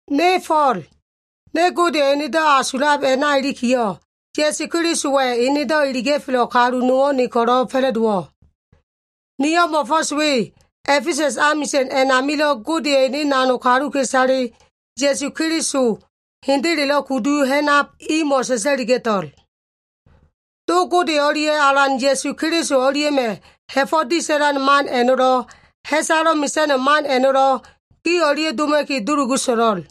Ne Fo꞉l, ne Godeya꞉ enedo꞉ asulab a꞉na ilikiyo꞉, Ya꞉su Kelisowa꞉ enedo꞉ iliga꞉felo꞉ kalu nowo꞉ ne ko꞉lo꞉ fa꞉la꞉dowo꞉. Niyo꞉ mo꞉fo꞉s we A꞉fesa꞉s amisa꞉n a꞉namilo꞉ Godeya꞉ ene kaluka꞉isale, Ya꞉su Keliso hendelelo꞉ kudu ha꞉nab imo꞉ sa꞉sa꞉liga꞉to꞉l. Do Gode o꞉lia꞉ Alan Ya꞉su Keliso o꞉lia꞉ma꞉ ha꞉fo꞉ disa꞉lan man a꞉no꞉lo꞉, ha꞉salo꞉ mesa꞉no꞉ man a꞉no꞉lo꞉, gi o꞉lia꞉ doma꞉ki dulugu so꞉lo꞉l.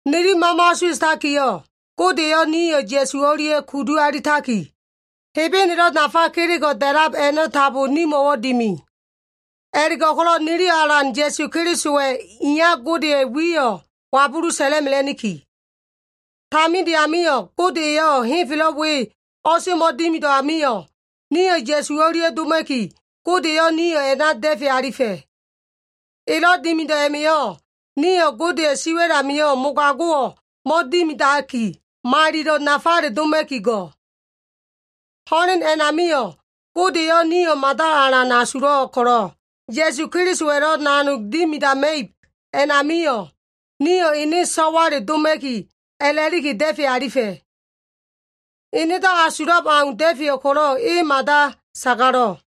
Nili mama asuwa꞉takiyo꞉, Gode eyo꞉ nio꞉ Ya꞉su o꞉lia꞉ kudu alitaki, Hebenelo꞉ nafa kelego꞉ da꞉lab a꞉no꞉ tambo nimo꞉wo꞉ dimi. A꞉la꞉go꞉ko꞉lo꞉ niliyo꞉ Alan Ya꞉su Kelisowa꞉ iya Godeya꞉ wiyo꞉ wabulu sa꞉la꞉mela꞉niki. Taminde amio꞉, Gode eyo꞉ henfelo꞉ we o꞉semo꞉ dimido꞉ amio꞉, nio꞉ Ya꞉su o꞉lia꞉ doma꞉ki, Gode eyo꞉ nio꞉ a꞉na da꞉fe alifa꞉. Elo꞉ dimido꞉ a꞉ma꞉yo꞉, nio꞉ Godeya꞉ siwa꞉l amio꞉ mogago꞉wo꞉ mo꞉dimidaki, malilo꞉ nafale doma꞉ki go꞉. Ho꞉len a꞉namio꞉, Gode eyo꞉ nio꞉ mada alan asulo꞉ ko꞉lo꞉, Ya꞉su Kelisowa꞉lo꞉ nanog dimidama꞉ib a꞉namio꞉, nio꞉ ene so꞉wale doma꞉ki a꞉la꞉liki da꞉fe alifa꞉. Enedo꞉ asulab au da꞉feyo꞉ ko꞉lo꞉ e mada sagalo꞉.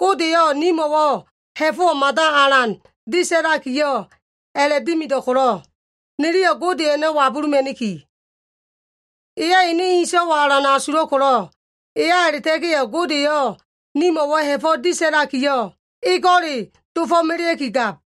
Gode eyo꞉ nimo꞉wo꞉ ha꞉fo꞉wo꞉ mada alan disa꞉lakiyo꞉ a꞉la꞉dimido꞉ ko꞉lo꞉, niliyo꞉ Gode a꞉no꞉ wabuluma꞉niki. Eyo꞉ ene so꞉wayo꞉ alan asulo꞉ ko꞉lo꞉, eya a꞉la꞉ta꞉ga꞉yo꞉ Gode eyo꞉ nimo꞉wo꞉ ha꞉fo꞉ disa꞉lakiyo꞉, ego꞉le dofo꞉melea꞉kigab.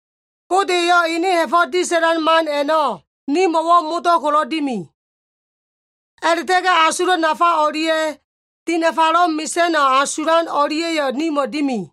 Gode eyo꞉ ene ha꞉fo꞉ disa꞉lan man a꞉no꞉ nimo꞉wo꞉ modo꞉ ko꞉lo꞉ dimi. A꞉la꞉ta꞉ga꞉ asulo꞉ nafa o꞉lia꞉ dinafalo꞉ mesa꞉no꞉ asulan o꞉lia꞉yo꞉ nimo꞉ dimi.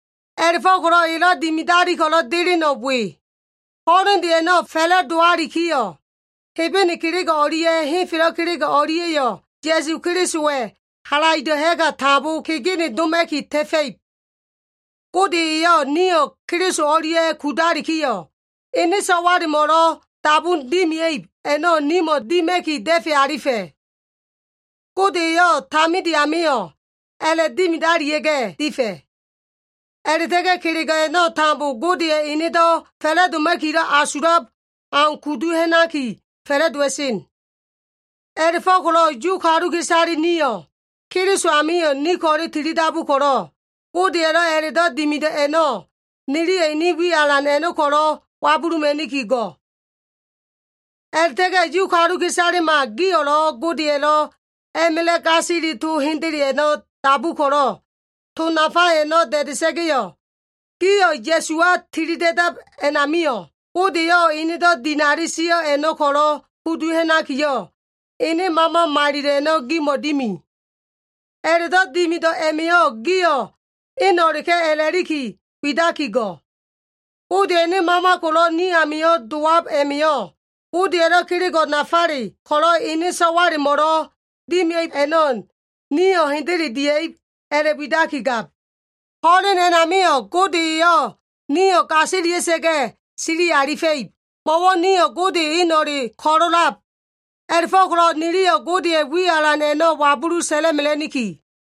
A꞉la꞉fo꞉ko꞉lo꞉ elo꞉ dimadali ko꞉lo꞉ deleno꞉ we. Ho꞉lende a꞉no꞉ fa꞉la꞉dowalikiyo꞉, Hebene kelego꞉ o꞉lia꞉ henfelo꞉ kelego꞉ o꞉lia꞉yo꞉, Ya꞉su Kelisowa꞉ halaido꞉ ha꞉ga tambo kegene doma꞉ki ta꞉fa꞉ib. Gode eyo꞉ nio꞉ Keliso o꞉lia꞉ kudalikiyo꞉, ene so꞉walemo꞉lo꞉ dabun dimia꞉ib a꞉no꞉ nimo꞉ dima꞉ki da꞉fe alifa꞉. Gode eyo꞉ taminde amio꞉ a꞉la꞉dimidalia꞉ga꞉ difa꞉. A꞉la꞉ta꞉ga꞉ kelego꞉ a꞉no꞉ tambo Godeya꞉ enedo꞉ fa꞉la꞉doma꞉kilo꞉ asulab au kudu ha꞉naki fa꞉la꞉dowa꞉sen. A꞉la꞉fo꞉ko꞉lo꞉ Yu kaluka꞉isale nio꞉, Keliso amio꞉ ni ko꞉le tilidabu ko꞉lo꞉, Godeya꞉lo꞉ a꞉la꞉do꞉ dimido꞉ a꞉no꞉, niliyo꞉ ene wi alan a꞉no꞉ ko꞉lo꞉ wabuluma꞉niki go꞉. A꞉la꞉ta꞉ga꞉ Yu kaluka꞉isalema gio꞉lo꞉ Godeya꞉lo꞉ a꞉ma꞉la꞉ gasili to hendele a꞉no꞉ dabu ko꞉lo꞉, to nafa a꞉no꞉ da꞉da꞉sa꞉ga꞉yo꞉, gio꞉ Ya꞉suwa tilida꞉dab a꞉namio꞉, Gode eyo꞉ enedo꞉ dinali sio꞉ a꞉no꞉ ko꞉lo꞉ kudu ha꞉nakiyo꞉, ene Mama Malilo꞉ a꞉no꞉ gimo꞉ dimi. A꞉la꞉do꞉ dimido꞉ a꞉ma꞉yo꞉, gio꞉ eno꞉leka꞉ a꞉la꞉liki widaki go꞉. Godeya꞉ ene Mama ko꞉lo꞉ ni amio꞉ dowab a꞉ma꞉yo꞉, Godeya꞉lo꞉ kelego꞉ nafale ko꞉lo꞉ ene so꞉walemo꞉lo꞉ dimia꞉ib a꞉no꞉ nio꞉ hendele dia꞉ib a꞉la꞉widakigab. Ho꞉len a꞉namio꞉ Gode eyo꞉ nio꞉ gasilia꞉sa꞉ga꞉ sili alifa꞉ib, mo꞉wo꞉ nio꞉ Gode eno꞉le ko꞉lo꞉lab. A꞉la꞉fo꞉ko꞉lo꞉ niliyo꞉ Godeya꞉ wi alan a꞉no꞉ wabulu sa꞉la꞉mela꞉niki.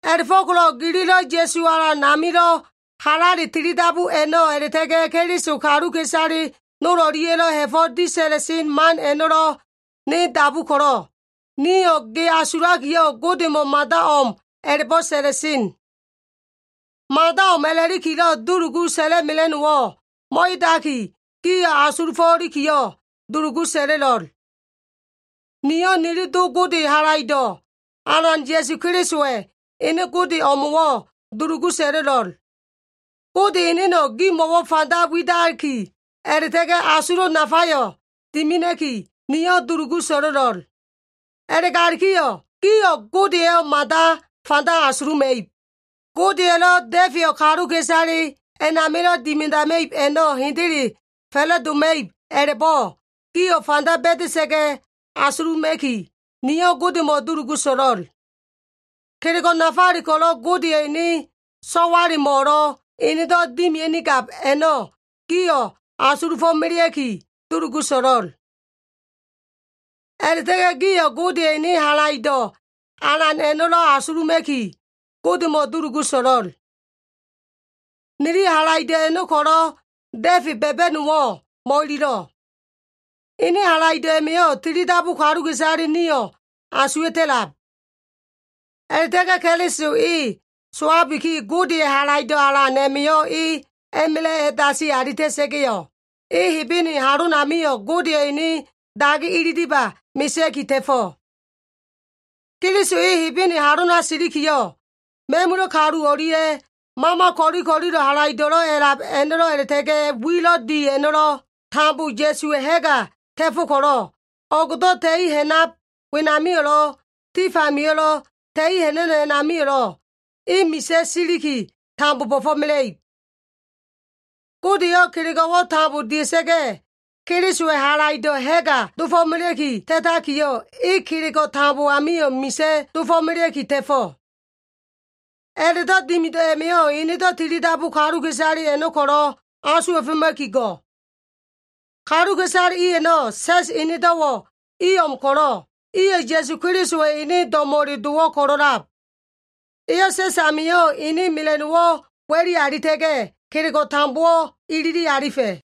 A꞉la꞉fo꞉ko꞉lo꞉ gililo꞉ Ya꞉su Alan amilo꞉ halale tilidabu a꞉no꞉ a꞉la꞉ta꞉ga꞉, Keliso kaluka꞉isale nol o꞉lia꞉yo꞉lo꞉ ha꞉fo꞉ disa꞉la꞉sen man a꞉no꞉lo꞉ ne dabu ko꞉lo꞉, niyo꞉ ge asulakiyo꞉ Godemo꞉ mada o꞉m a꞉la꞉bo꞉ sa꞉la꞉sen. Mada o꞉m a꞉la꞉likilo꞉ dulugu sa꞉la꞉mela꞉no꞉wo꞉ mo꞉edaki, gio꞉ asulufo꞉likiyo꞉ dulugu sa꞉la꞉lo꞉l. Niyo꞉ nili Do Gode Halaido꞉, Alan Ya꞉su Kelisowa꞉ ene Gode o꞉mo꞉wo꞉ dulugu sa꞉la꞉lo꞉l. Gode eneno꞉ gimo꞉wo꞉ fanda widaki, a꞉la꞉ta꞉ga꞉ asulo꞉ nafayo꞉ dimina꞉ki, niyo꞉ dulugu so꞉lo꞉l. A꞉la꞉galikiyo꞉ gio꞉ Godeyo꞉ mada fanda asuluma꞉ib. Godeya꞉lo꞉ da꞉feyo꞉ kaluka꞉isale a꞉namilo꞉ dimidama꞉ib a꞉no꞉ hendele fa꞉la꞉doma꞉ib a꞉la꞉bo꞉, gio꞉ fanda ba꞉da꞉sa꞉ga꞉ asuluma꞉ki, niyo꞉ Godemo꞉ dulugu so꞉lo꞉l. Kelego꞉ nafale ko꞉lo꞉ Godeya꞉ ene so꞉walemo꞉lo꞉ enedo꞉ dimia꞉nigab a꞉no꞉ gio꞉ asulufo꞉melea꞉ki, dulugu so꞉lo꞉l. A꞉la꞉ta꞉ga꞉ gio꞉ Godeya꞉ ene halaido꞉ alan a꞉no꞉lo꞉ asuluma꞉ki, Godemo꞉ dulugu so꞉lo꞉l. Niliyo꞉ halaido꞉ a꞉no꞉ ko꞉lo꞉ da꞉fe ba꞉ba꞉no꞉wo꞉ mo꞉ililo꞉. Ene halaido꞉ a꞉ma꞉yo꞉ tilidabu kaluka꞉isale nio꞉ asuwa꞉ta꞉lab. A꞉la꞉ta꞉ga꞉ Keliso e sowabiki, Godeya꞉ halaido꞉ alan a꞉ma꞉yo꞉ e a꞉ma꞉la꞉ a꞉dasi alita꞉sa꞉ga꞉yo꞉, e Hebene halonamio꞉ Godeya꞉ ene dagi ililiba mesea꞉ki ta꞉fo꞉. Keliso e Hebene halona silikiyo꞉, ma꞉mula꞉ kalu o꞉lia꞉, mama ko꞉li ko꞉lilo꞉ halaido꞉lo꞉ a꞉lab a꞉no꞉lo꞉ a꞉la꞉ta꞉ga꞉ wilo꞉ di a꞉no꞉lo꞉, tambo Ya꞉suwa꞉ ha꞉ga ta꞉fo꞉ ko꞉lo꞉, o꞉go꞉do꞉ ta꞉i ha꞉nab wenamio꞉lo꞉ tif amio꞉lo꞉ ta꞉i ha꞉na꞉no꞉ a꞉namio꞉lo꞉, E misa꞉ siliki tambo bo꞉fo꞉mela꞉ib. Gode eyo꞉ kelego꞉wo꞉ tambo dia꞉sa꞉ga꞉, Kelisowa꞉ halaido꞉ ha꞉ga dofo꞉melea꞉ki ta꞉takiyo꞉, e kelego꞉ tambo amio꞉ misa꞉ dofo꞉melea꞉ki ta꞉fo꞉. A꞉la꞉do꞉ dimido꞉ a꞉ma꞉yo꞉ enedo꞉ tilidabu kaluka꞉isale a꞉no꞉ ko꞉lo꞉ asuwa꞉foma꞉ki go꞉. Kaluka꞉isale i a꞉no꞉ sa꞉s enedo꞉wo꞉ i o꞉m ko꞉lo꞉, iyo꞉ Ya꞉su Kelisowa꞉ ene do꞉mo꞉le dowo꞉ ko꞉lo꞉lab. Eyo꞉ sa꞉s amio꞉ ene mela꞉no꞉wo꞉ wa꞉li alita꞉ga꞉, kelego꞉ tambowo꞉ ilili alifa꞉.